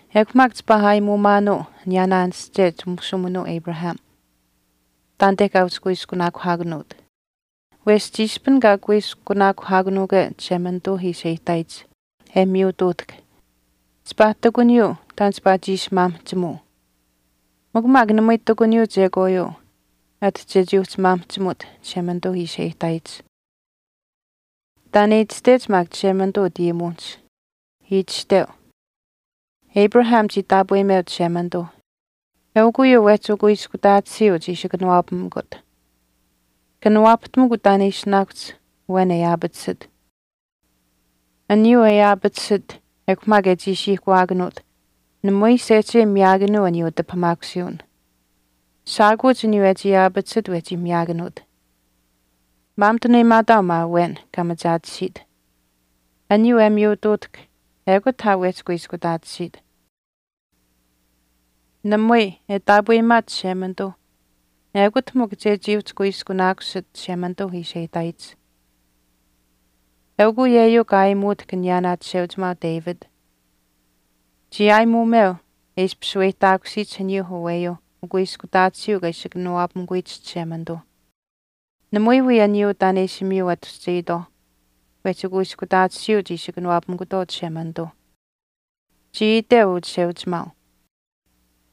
Ekw maak chipaa aayimuumaanuu aniyaanaa aanische chimushuuminuu Abraham taanite kaa uhchi kuiskunaakuhaakanuut. Wesh chiishpin kaa kuiskunaakuhaakanuukwe Chishemanituu ishi e ihtaayich e miyutuutahk, chipaa ihtakuniyuu taan chipaa chiishi maamihchimuu. Mikw maak namui ihtakuniyuu chekwaayuu ati chechii uhchi maamihchimut Chishemanituu ishi e ihtaayich. Taan e itashtech maak Chishemanituu utayimuwinihch. Itashteu, Abraham chii taapweyimeu Chishemanituu eukw uyuu wehchi ukuiskutaatisiiu chii ishi kanawaapamikut. Kanawaapahtamukw taan e ishinaakuhch awen e aapatisit. Aniyuu e aapatisit ekw maak e chiishiihkawaakanuut namui sehchei miyaakanuu aniyuu utipahamaakusiiwin. Shaakuuch aniyuu e chii aapatisit wehchi miyaakanuut. Maamituneyimaataau maa awen kaa machaatisiit. Aniyuu e miyutuutahk ekut aa wehchi kuiskutaatisiit. Namui, e taapweyimaat Chishemanituu ekut mikw chechii uhchi kuiskunaakusit Chishemanituu ishi e ihtaayich. Eukw uyeyuu kaa aayimuutahk aniyaa chisheuchimaau David. Chii aayimuumeu e ishpish shaweyihtaakusiyich aniyuu aweyuu ukuiskutaatisiiu kaa ishi kanawaapamikuyich Chishemanituu. Namui wii aniyuu taan e ishi miyu atushchetwaau wehchi ukuiskutaatisiiuch ishi kanawaapamikutwaau Chishemanituu. Chii iteu uu chisheuchimaau,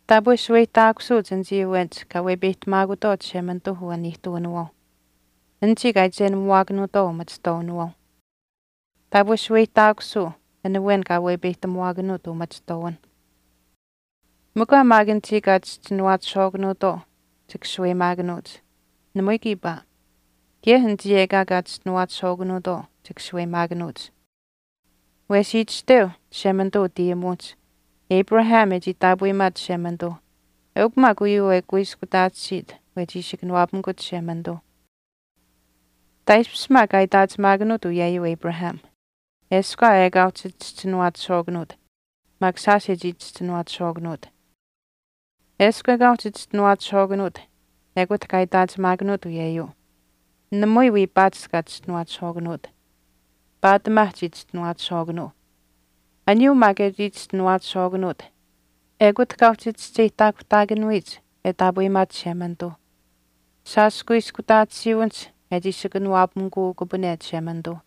Taapwe shaweyihtaakusuuch anichii awenich kaa wepeyihtamaakutwaau Chishemanituu uwaniihtuwinawaauh, anichii kaa iichenamuwaakanuutwaau umachihtwaawinawaauh. Taapwe shaweyihtaakusuu an awen kaa wepeyihtamuwaakanuut umachihtwaawinh. Mikw aa maak anichii kaa chischinuwaachishwaakanuutwaau chika shaweyimaakanuuch. Namui kiipaa. Kaye anichii ekaa kaa chischinuwaachishwaakanuutwaau chika shaweyimaakanuuch. Wesh itashteu Chishemanituu utayimuwinihch, Abraham e chii taapweyimaat Chishemanituuh eukw maak uyuu e kuiskutaatisiit wehchi ishi kanawaapamikut Chishemanituu. Taaishpish maak kaa itaachimaakanuut uyeyuu Abraham, eshkw aa ekaa uhchi chischinuwaachishwaakanuut maak shaash e chii chischinuwaachishwaakanuut. Eshkw ekaa uhchi chischinuwaachishwaakanuut ekut kaa itaachimaakanuut uyeyuu, namui wii paatish kaa chischinuwaachishwaakanuut. Paatimaa chii chischinuwaachishwaakanuu. Aniyuu maak e chii chischinuwaachishwaakanuut ekut kaa uhchi chischeyihtaakuhtaakanuyich e taapweyimaat Chishemanituu, shaash kuiskutaatisiiwinihch e chii ishi kanawaapamikuukupane Chishemanituu.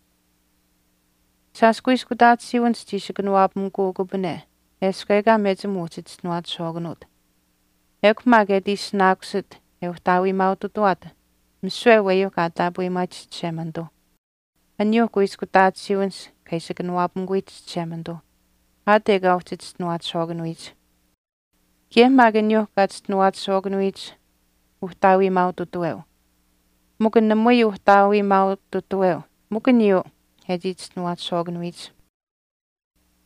Shaash kuiskutaatisiiwinihch chii ishi kanawaapamikuukupane eshkw ekaa mechim uhchi chischinuwaachishwaakanuut. Ekw maak e ati ishinaakusit e uhtaawiimaaututawaat misiwe aniyuuh kaa taapweyimaayich Chishemanituu, aniyuuh kuiskutaatisiiwinihch kaa ishi kanawaapamikuyich Chishemanituu, aat ekaa uhchi chischinuwaachishwaakanuyich. Kaye maak aniyuuh kaa chischinuwaachishwaakanuyich uhtaawiimaaututaweu, mikw namui uhtaawiimaaututaweu mikw aniyuu e chii chischinuwaachishwaakanuyich.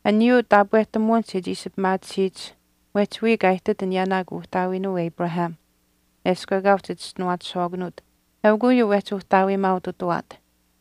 Aniyuu taapwehtamuwinihch e ishi pimaatisiyich mwehch wiya kaa ihtit aniyaanaa kuuhtaawiinuu Abraham eshkw ekaa uhchi chischinuwaachishwaakanuut eukw uyuu wehchi uhtaawiimaaututawaat.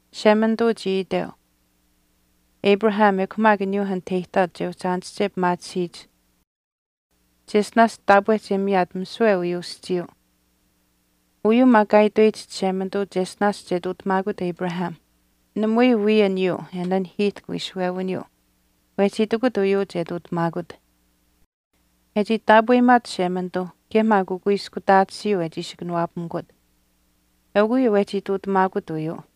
Chishemanituu chii iteu Abraham ekw maak aniyuu anit e ihtaat che uhchi aanische pimaatisiyich cheshtinaash taapwe che miyaat misiwe uyuu aschiiyuu. Uyuu maak kaa itweyich Chishemanituu cheshtinaash che ihtuutamaakut Abraham namui wii aniyuu e nanihiihtahk wiishuwewiniyuu wehchii itikut uyuu che ihtuutamaakut. E chii taapweyimaat Chishemanituu kaye maak ukuiskutaatisiiu e chii ishi kanawaapamikut eukw uyuu wehchii ihtuutamaakut uyuu.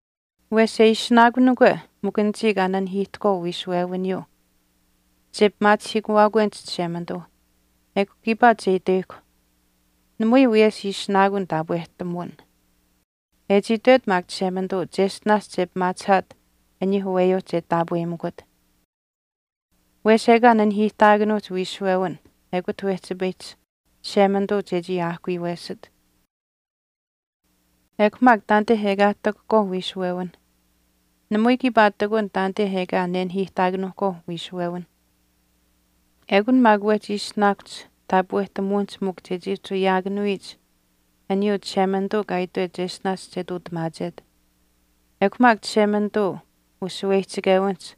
Wesh e ishinaakunikwe mikw anichii kaa nanihiihtahkwaau wiishuwewiniyuu che pimaachihiikuwaakwenich Chishemanituu ekw kiipaa chechii itweyihkw, namui wiyesh ishinaakun taapwehtamuwin, e chii itwet maak Chishemanituu cheshtinaash che pimaachihaat aniyuu aweyuu che taapweyimikut. Wesh ekaa nanihiihtaakanuuhch wiishuwewin ekut wehchipayiyich Chishemanituu chechii aahkuyuwesit. Ekw maak taanite ekaa e ihtakuhkwaauh wiishuwewinh namui kiipaa ihtakun taanite ekaa nenihiihtaakanuuhkwaau wiishuwewinh. Ekun maak wehchi ishinaakuhch taapwehtamuwinihch mikw chechii uhchi ayaakanuyich aniyuu Chishemanituu kaa itwet cheshtinaash che ihtuutamaachet. Ekw maak Chishemanituu ushaweyihchichewinihch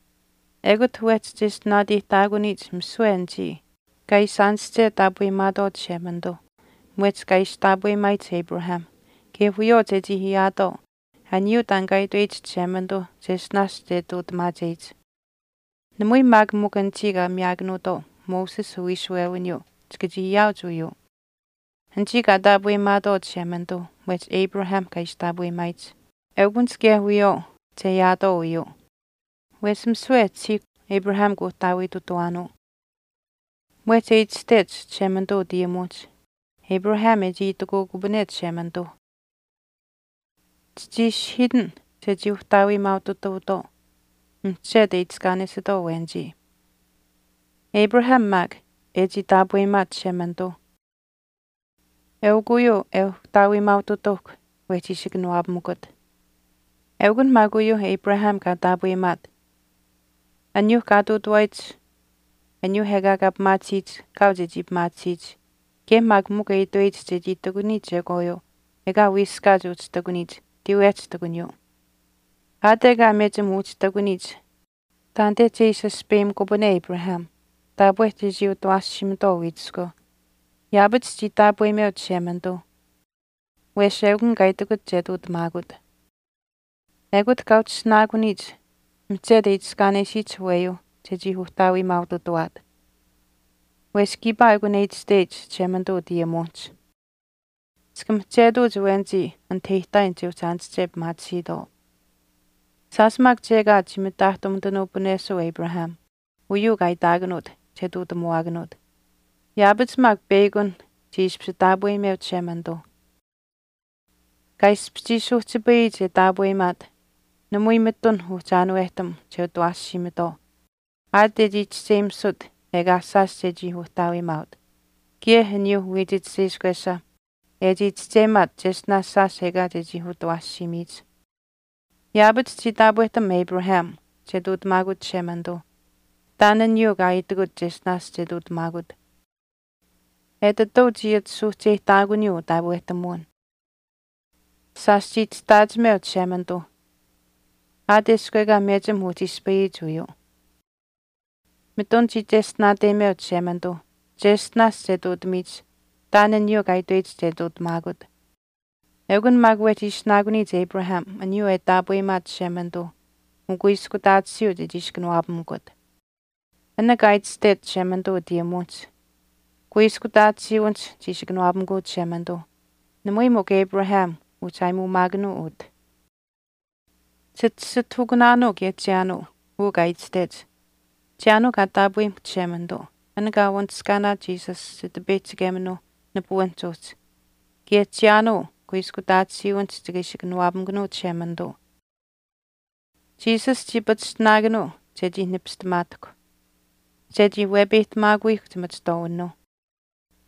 ekut wehchi cheshtinaateyihtaakuniyich misiwe anichii kaa ishi aanische taapweyimaatwaau Chishemanituu mwehch kaa ishi taapweyimaayich Abraham kaye wiyawaau chechii ayaatwaau aniyuuh taan kaa itweyich Chishemanituuh cheshtinaash che ihtuutamaacheyich. Namui maak mikw anichii kaa miyaakanuutwaau Moses uwiishuwewiniyuu chika chii ayaauch uyuu. Anichii kaa taapweyimaatwaau Chishemanituuh mwehch Abraham kaa ishi taapweyimaayich eukunich kaye wiyawaau che ayaatwaau uyuu. Wesh misiwe e tashiihkw Abraham kuuhtaawiitutuwaanuu. Mwehch e itashtech Chishemanituu utayimuwinihch Abraham e chii itikuukupane Chishemanituuh, Chichii ishihiitin chechii uhtaawimaaututuutwaau mihchetu e itiskaanesitwaau awenichii. Abraham maak e chii taapweyimaat Chishemanituu eukw uyuu e uhtaawiimaaututauhkw wehchii ishi kanawaapamikut. Eukunh maak uyuuh Abraham kaa taapweyimaat, aniyuuh kaa ihtuutawaayich aniyuuh ekaa kaa pimaatisiyich kaau chechii pimaatisiyich kaye maak mikw e itweyich chechii ihtakuniyich chekwaayuu ekaa wiiskaat uhchi ihtakuniyich tiiwehch ihtakuniyuu. Aat ekaa mechim uhchi ihtakuniyich taanite che ishi aspeyimukupane Abraham taapwe chechii utawaashiimitwaau wiichiskweu, yaapach chii taapweyimeu Chishemanituuh wesh ekun kaa itikut che ihtuutamaakut. Ekut kaa uhchi ishinaakuniyich mihchetu e itiskaanesiyich aweyuuh chechii uhtaawiimaaututawaat. Wesh kiipaa ekun e itashteyich Chishemanituu utayimuwinihch, Chika mihchetuuch awenichii anite e ihtaayin che uhchi aanische pimaatisiitwaau. Shaash maak chekaat chii mitaahtumitanuupunesuu Abraham uyuu kaa itaakanuut che ihtuutamuwaakanuut. Yaapach maak peyakun chii ishpish taapweyimeu Chishemanituuh. Kaa ishpish chii suuhchipayiyich e taapweyimaat namui mitun uhchi aanuwehtam che utawaashiimitwaau aat e chii chischeyimisut ekaa shaash chechii uhtaawimaaut kaye aniyuuh wiich chisheishkwesha e chii chischeyimaat cheshtinaash shaash ekaa chechii utawaashiimiyich. Yaapach chii taapwehtam Abraham che ihtuutamaakut Chishemanituu taan aniyuuh kaa itikut cheshtinaash che ihtuutamaakut. Etituu chii ati suuhcheyihtaakuniyuu utaapwehtamuwin. Shaash chii chishtaachimeu Chishemanituuh aat eshkw ekaa mechim uhchi ispayiyich uyuu. Mitun chii cheshtinaateyimeu Chishemanituuh cheshtinaash che ihtuutamiyich taan aniyuuh kaa itweyich che ihtuutamaakut. Ekun maak wehchii ishinaakuniyich Abraham aniyuu e taapweyimaat Chishemanituu ukuiskutaatisiiu chechii ishi kanawaapamikut. An kaa itashtech Chishemanituu utayimuwinihch, Kuiskutaatisiiwinihch chiishi kanawaapamikuu Chishemanituuh, namui mikw Abraham uhchi aayimuumaakanuu utah. Chitasitahukunaanuu kaye chiyaanuu uu kaa itashtech, chiyaanuu kaa taapweyimuhkw Chishemanituu an kaa wanishkaanaat Jesus Chitipeyihchikeminuu nipuwinihch uhchi. Kaye chiyaanuu kuiskutaatisiwinihch chika ishi kanawaapamikunuu Chishemanituu. Jesus chii pachishtinaakanuu chechii nipistamaatahkw chechii wepeyihtamaakuyihkw chimachihtwaawinuuh,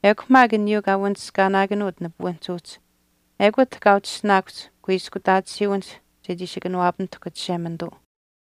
ekw maak aniyuu kaa wanishkaanaakanuut nipuwinihch uhchi ekut kaa uhchi ishinaakuhch kuiskutaatisiiwinihch chechii ishi kanawaapamitahk Chishemanituu.